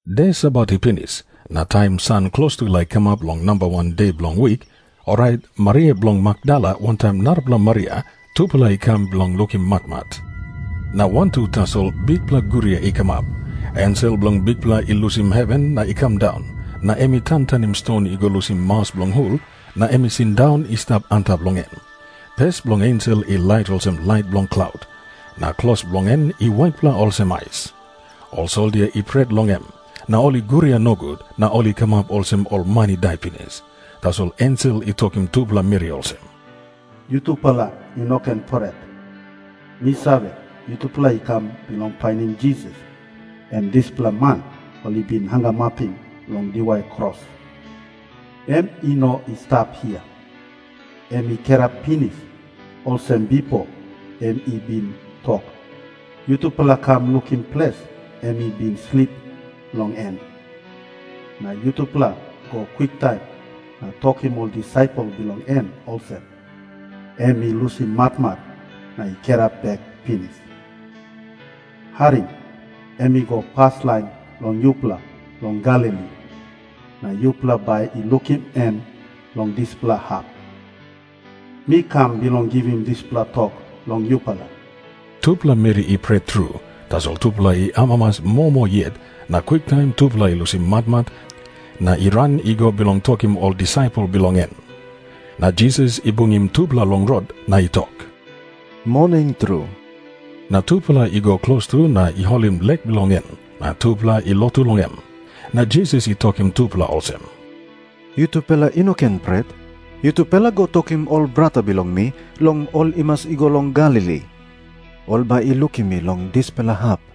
De Sabat i pinis, na taim san klostu i laik kamap long namba wan de bilong wik, orait Maria bilong Makdala wantaim narapela Maria tupela i kam bilong lukim matmat. Na wantu tasol bikpela guria i kamap. Ensel bilong Bikpela i lusim heven na i kam daun, na em i tantanim ston i go lusim maus bilong hul na em i sindaun i stap antap long en. Pes bilong ensel i lait olsem lait bilong klaut, na klos bilong en i waitpela olsem ais. Ol soldia i pret long em, na ol i guria nogut, na ol i kamap olsem ol man i dai pinis. Tasol ensel i tokim tupela meri olsem, "Yutupela i no ken pret. Mi save, yutupela i kam bilong painim Jisas, em dispela man ol i bin hangamapim long diwai kros. Em i no i stap hia. Em i kirap pinis, olsem bipo em i bin tok. Yutupela kam lukim ples em i bin slip long en. Na yutupela go kwiktaim na tokim ol disaipel bilong en olsem, em i lusim matmat na i kirap bek pinis. Harim. Em i go paslain long yupela long Galili, na yupela bai i lukim em long dispela hap. Mi kam bilong givim dispela tok long yupela." Tupela meri i pret tru, tasol tupela i amamas moa moa yet, na kwiktaim tupela i lusim matmat na i ran i go bilong tokim ol disaipel bilong en. Na Jisas i bungim tupela long rot, na i tok, "Moning tru." Na tupela i go klostu na i holim lek bilong en, na tupela i lotu long em. Na Jisas i tokim tupela olsem, "Yutupela i no ken pret. Yutupela go tokim ol brata bilong mi long ol i mas i go long Galili. Ol bai i lukim mi long dispela hap."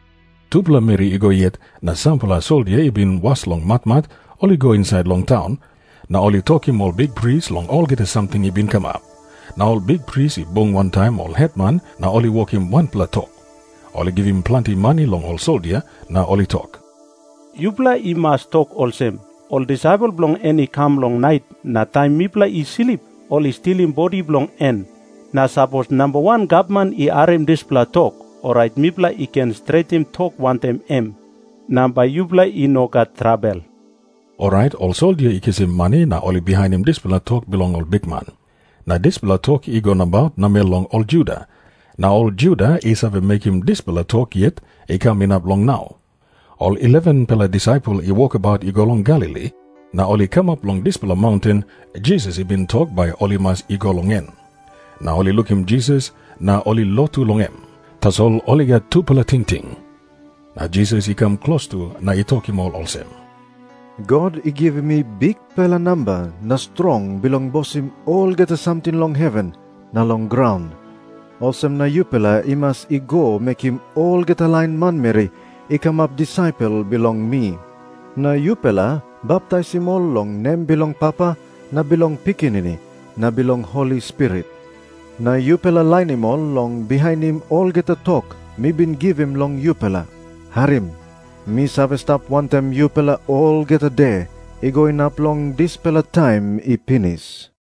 Tupela meri i go yet, na sampela soldia i bin was long matmat ol i go insait long taun, na ol i tokim ol bikpris long olgeta samting i bin kamap. Na ol bikpris i bung wantaim ol hetman, na ol i wokim wanpela tok. Ol i givim planti mani long ol soldia, na ol i tok, "Yupela i mas tok olsem, 'Ol disaipel bilong en i kam long nait, na taim mipela i slip, ol i stilim bodi bilong en.' Na sapos namba wan gavman i harim dispela tok, orait mipela i ken stretim tok wantaim em, na bai yupela i no gat trabel." Orait ol soldia i kisim mani, na ol i bihainim dispela tok bilong ol bikman. Na dispela tok i go nabaut namel long ol Juda, na ol Juda i save mekim dispela tok yet i kam inap long nau. Ol 11-pela disaipel i wokabaut i go long Galili, na ol i kamap long dispela maunten Jisas i bin tok bai ol i mas i go long en. Na ol i lukim Jisas, na ol i lotu long em. Tasol sampela i gat tupela tingting. Na Jisas i kam klostu na i tokim ol olsem, "God i givim mi bikpela namba na strong bilong bosim olgeta samting long heven na long graun. Olsem na yupela i mas i go mekim olgeta lain manmeri i kamap disaipel bilong mi. Na yupela baptaisim ol long nem bilong Papa na bilong Pikinini na bilong Holi Spirit. Na yupela lainim ol long bihainim olgeta tok mi bin givim long yupela. Harim. Mi save stap wantaim yupela olgeta de, i go inap long dispela taim i pinis."